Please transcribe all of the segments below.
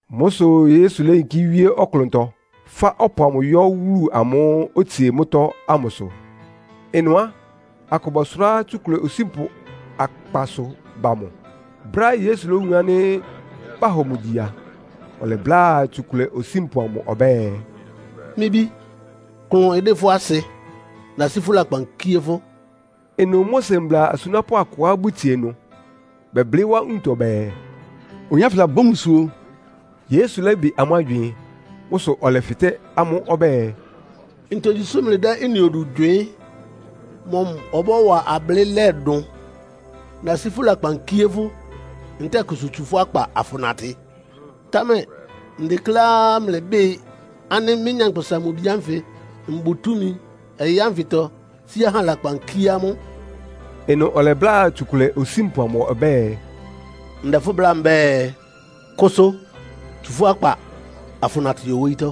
Mʋ́ sʋ Yesu léyinkí wíé ɔklʋntɔ, fá ɔpʋ amʋ yɔ́ wúlu amʋ́ʋ́ otsie mʋ́tɔ́ ámʋsʋ. Ɩnʋ á, akʋ bɔsʋrá tsukʋlɛ osínpʋ akpasʋ ba mʋ. Brɛ́á Yesu lówun ánɩ́ bahɔ mʋ gyi a, ɔlɛbláa tsukʋlɛ osínpʋ amʋ ɔbɛ́ɛ, “Mɩ́ bí, klʋn ɩdɩ́ fʋ́ asɩ. Nasí fʋ́ lakpan kíé fʋ́.” Ɩnʋ Mose mbla asunápʋ́ akʋá bʋtsie ɩnʋ, bɛblɩ́ wá nwuntɔ bɛɛ, “Oyin ánfɩ labɔ́ mbusuo.” Yesu lɛ́bɩ amʋ́ agywɩɩn. Mʋ́ sʋ ɔlɛfɩtɛ́ amʋ́ ɔbɛ́ɛ, “Ntogyi sʋ́ mlɩdɛ́ ɩ́nɩ odu gywɩɩ́n? Mɔmʋ bɔ́wa ablɩ́lɛ́ dʋn? ‘Nasí fʋ́ lakpan kíé fʋ́.’ ntɛ́ɛ ‘Kʋsʋ tsu fʋ́ akpa afʋnatɩ?’ Támɛ ndekléá mlɩbɩ́ɩ ánɩ́ mɩ́, Nyankpʋsa-Mʋ-Bi ánfɩ mbʋ túmi ɔyɩ́ ánfɩtɔ sí ahá lakpan kíé amʋ́.” Ɩnʋ ɔlɛbláa tsukʋlɛ osínpʋ amʋ ɔbɛ́ɛ, “Ndɛ fʋ́ bláa mbɛ́ɛ, kʋsʋ. Tsu fʋ́ akpa afʋnatɩ yɔ wóyítɔ́!”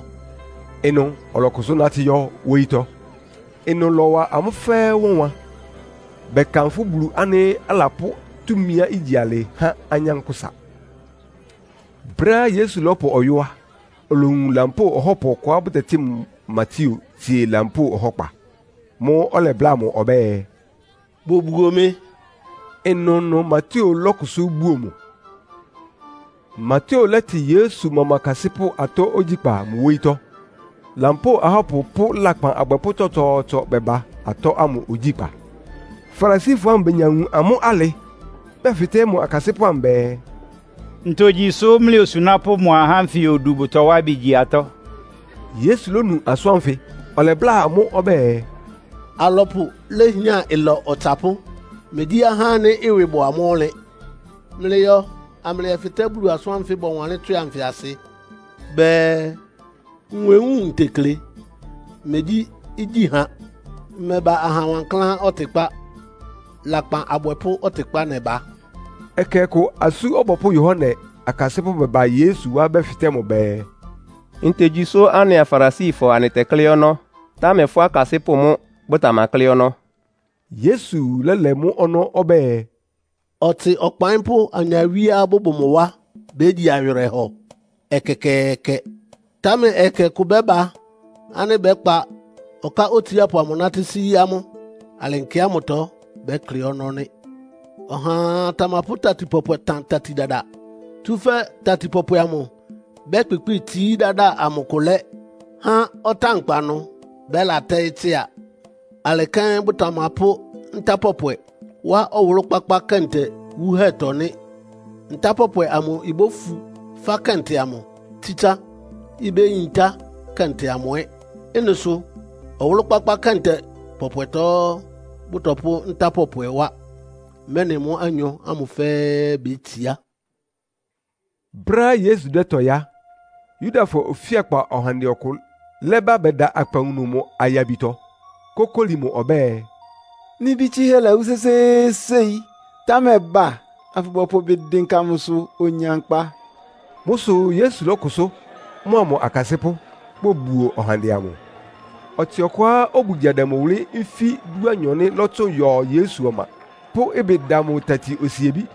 Ɩnʋ ɔlɔkʋsʋ́ nátɩ́ yɔ́ wóyítɔ́. Ɩ́nɩ lɔ́wa amʋ́ fɛ́ɛ́ wánwan, bɛkanfʋ́ Bulu ánɩ́ alapʋ́ túmiá igyi alɩ há anyánkpʋ́sa. Brɛ́á Yesu lɔ́pʋ ɔyɔ́ á, olowun lampóo ɔhɔ́pʋ ɔkʋá bʋtɛtɩ́ mʋ Mateo tsie lampóo ɔhɔ́kpa. Mʋ́ʋ́ ɔlɛbláa mʋ ɔbɛ́ɛ, “Bobuo mɩ.” Ɩnʋnʋ Mateo lɔ́kʋsʋ́ buo mʋ. Mateo lɛ́tɩ Yesu mʋa mʋ akasɩ́pʋ́ atɔ́ ogyíkpá mʋ wóyítɔ́. Lampóo ahɔ́pʋ pʋ́ lakpan abwɛpʋ́ tsɔtsɔɔtsɔ bɛba atɔ́ ámʋ ogyíkpá. Farisifɔ ámʋ benya wun amʋ́ alɩ, bɛfɩtɛ́ mʋ akasɩ́pʋ́ amʋ bɛɛ, “Ntogyi sʋ́ mlɩ osunápʋ́ mʋa ahá ánfɩ odu bʋtɔwá ɩbɩ gyi atɔ́?” Yesu lónu asʋ́n ánfɩ, ɔlɛbláa amʋ́ ɔbɛ́ɛ, “Alɔpʋ léhián ɩlɔ ɔtsapʋ́, megyí ahá ánɩ́ ɩwɩ bʋ amʋ́ ɔnlɩn. Mlɩyɔ amlɩyɛfɩtɛ́ Bulu asʋ́n ánfɩ bɔwanlɩ́n tswɩ anfɩ asɩ. Bɛɛ, ‘Nwewúun ntekle, megyí igyíha.’ Mmɛba aha wankláán ɔtɩkpá, lakpan abwɛpʋ́ ɔtɩkpá nɛba.” Ɛkɛ ɔkʋ Asú Ɔbɔpʋ́ Yohane akasɩ́pʋ́ bɛba Yesu wá bɛfɩtɛ́ mʋ bɛɛ, “Ntogyi sʋ́ anɩa Farisifɔ anɩtɛklɩ́ ɔnɔ́, támɛ fʋ́ akasɩ́pʋ́ mʋ́ bʋtamaklɩ́ ɔnɔ́?” Yesu lɛ́lɛ mʋ́ ɔnɔ́ ɔbɛ́ɛ, “Ɔtsɩ ɔkpaɩ́npʋ́ anyawíeá bʋbʋ mʋ wá bégyi awɩrɛhɔ? Ɛkɛkɛɛkɛ! Támɛ ɛkɛ kʋ bɛ́ba ánɩ́ bɛ́kpa ɔká otsiápʋ amʋ nátɩ́ sí amʋ́. Alɩ nkɛ ámʋtɔ bɛ́klɩ́ ɔnɔ́ nɩ́.” “Ɔhaa tamapʋ́ tati pɔpwɛ tan tati dada. Tsúfɛ́ tati pɔpwɛ amʋ bɛ́kpɩkpɩ́ɩ tsií dáda amʋ kʋ lɛ́, há ɔtánkpa ɩnʋ bɛ́latɛ́ɩ́ tsɩ́a. Alɩ kɛ́n bʋtamapʋ́ nta pɔpwɛ wá ɔwʋlʋ́-kpákpá kɛntɛ wuhɛ́tɔ́ nɩ́. Nta pɔpwɛ amʋ ibófu fá kɛntɛ amʋ, tsítsá, ibéyintá kɛntɛ amʋ ɛ́. Ɩ́nɩ sʋ ɔwʋlʋ́-kpákpá kɛntɛ pɔpwɛtɔ bʋ́tɔpʋ́ nta pɔpwɛ wá, mɛ́nɩ mʋ́ anyɔ ámʋ fɛ́ɛ́ bétsiá.” Brɛ́á Yesu dɛ́tɔɩ́ á, Yudafɔ ofíakpa ɔhandɛ ɔkʋ lɛ́ba bɛda akpawunu mʋ ayabitɔ, kókóli mʋ ɔbɛ́ɛ, “Mɩ́ bí tsɩ́hɛ́ lawú sésééséi, támɛ ba afʋbɔpʋ ɩbɩ dɩnka mʋsʋ onya nkpa.” Mʋ́ sʋ Yesu lɔ́kʋsʋ́, mʋa mʋ akasɩ́pʋ́ bobuo ɔhandɛ amʋ. Ɔtsɩ ɔkʋá obugya dɛ mʋ wʋlɩ́ nfí dúanyɔ nɩ́ lɔ́tsʋn yɔ Yesu ɔma, pʋ́ ɩbɩ da mʋ tati osiebí.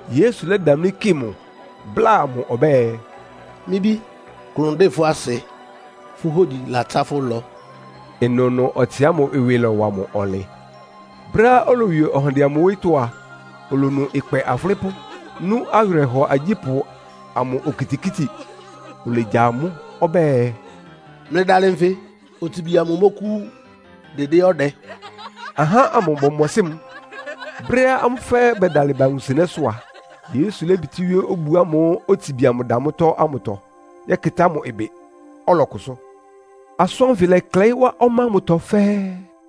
Yesu lɛ́damlí kɩ mʋ, bláa mʋ ɔbɛ́ɛ, “Mɩ́ bí, klʋn ɩdɩ́ fʋ́ asɩ. Fʋ́ hógyi latsá fʋ́ ɩlɔ.” Ɩnʋnʋ ɔtsɩ ámʋ ɩwɩ lɔ́wa mʋ ɔnlɩn. Brɛ́á olowie ɔhandɛ amʋ wóyítɔ́ a, olowun ɩkpɛ afʋlɩ́pʋ́, nú awɩrɛhɔ agyípʋ́ amʋ okitikíti. Olegya amʋ́ ɔbɛ́ɛ, “Mlɩdalɩ nfɩ! Otsibi amʋ mɔ́kʋ́wú, dɩdɩ́ ɔdɛ.” Ahá ámʋ bɔmɔsɩ́ mʋ. Brɛ́á amʋ́ fɛ́ɛ́ bɛdalɩ ba wunsɩnɛ́sʋ́ a, Yesu lébitíwíé obu ámʋ́ʋ́ otsibi amʋ da mʋ́tɔ́ ámʋtɔ yɛ́kɩtá mʋ ɩbɩ, ɔlɔkʋsʋ́. Asʋ́n ánfɩ lɛ́klɛɩ́ wá ɔmá ámʋtɔ fɛ́ɛ́.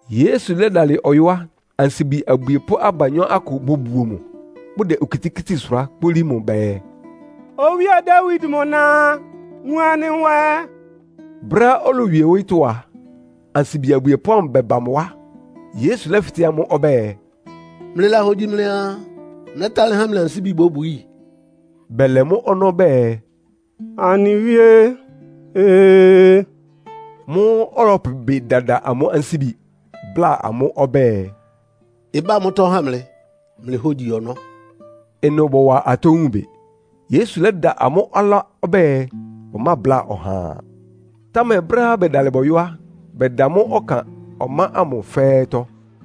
Yesu lɛ́dalɩ ɔyɔ́ á, ansibi abwiepʋ́ abanyɔ́ akʋ bobuo mʋ, bʋdɛ okitikíti sʋrá kpólí mʋ bɛɛ, “Owíe Dawid mʋ na, wun anɩ nwɛ!” Brɛ́á olowie wóyítɔ́ a, ansibi abwiepʋ́ ámʋ bɛba mʋ wá. Yesu lɛ́fɩtɛ́ amʋ́ ɔbɛ́ɛ, “Mlɩlahogyi mlɩaa, nɛ́talɩ́ há mlɩ ansíbi bóbwií?” Bɛlɛ mʋ́ ɔnɔ́ bɛɛ, “Anɩ Wíé, Ee!” Mʋ́ʋ́ ɔlɔpʋ ɩbɩ dada amʋ́ ansíbi, bláa amʋ́ ɔbɛ́ɛ, “Ɩbá mʋ́tɔ́ ha mlɩ, mlɩ hógyi ɔnɔ́.” Ɩnʋ bɔwa atɔ́ wun bɩ. Yesu lɛ́da amʋ́ ɔlá ɔbɛ́ɛ, bʋmábláa ɔhaa. Támɛ brɛ́á bɛdalɩ bɔyɔ́ á, bɛda mʋ ɔkan ɔmá ámʋ fɛ́ɛ́tɔ́.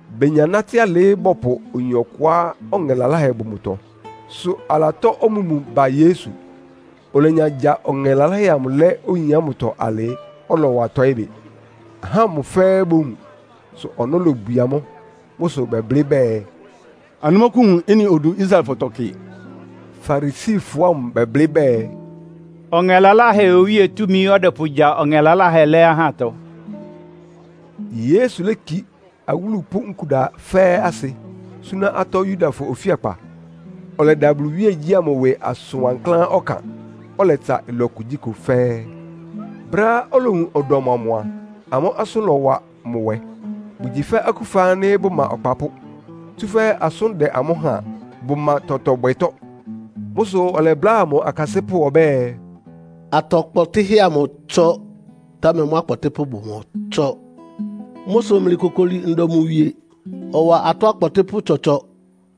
Benya nátɩ́ alɩ, bɔpʋ oyin ɔkʋá ɔŋɛ laláhɛ bʋ mʋtɔ, sʋ alatɔ́ omúmu ba Yesu. Olenya gya ɔŋɛ laláhɛ amʋ lɛ́ oyin ámʋtɔ alɩ, ɔlɔwa tɔɩ́ bɩ. Ahá ámʋ fɛ́ɛ́ bowun, sʋ ɔnɔ́ lobwie amʋ́. Mʋ́ sʋ bɛblɩ́ bɛɛ, “Anɩmɔ́kʋ́wun ɩ́nɩ odu Israelfɔtɔ kɩ!” Farisifɔ ámʋ bɛblɩ́ bɛɛ, “Ɔŋɛ laláhɛ owíe túmi ɔdɛpʋgya ɔŋɛ laláhɛ lɛ́ ahátɔ.” Yesu léki awúlu pʋ́ nkuda fɛ́ɛ́ asɩ, súná atɔ́ Yudafɔ ofíakpa. Ɔlɛda Bulu iwíegyí ámʋ ɩwɩ asʋn wankláán ɔkan. Ɔlɛtsa ɩlɔ kugyíkʋ fɛ́ɛ́. Brɛ́á olowun ɔdɔm amʋ a, amʋ́ asʋ́n lɔ́wa mʋ nwɛ. Bʋgyi fɛ́ akúfa ánɩ́ bʋma ɔkpapʋ́, tsúfɛ́ asʋ́n dɛ amʋ́ háan, bʋma tɔtɔ bwɛtɔ́. Mʋ́ sʋ ɔlɛbláa mʋ akasɩ́pʋ́ ɔbɛ́ɛ, “Atɔ kpɔtɩ́hɛ́ amʋ ɩtsɔ, támɛ mʋ́ akpɔtɩ́pʋ́ bʋmɔtsɔ́. Mʋ́ sʋ mlɩkokoli ndɔ mʋ wie, ɔwa atɔ́ akpɔtɩ́pʋ́ tsɔtsɔ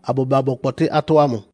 abʋba bɔkpɔtɩ́ atɔ́ ámʋ.”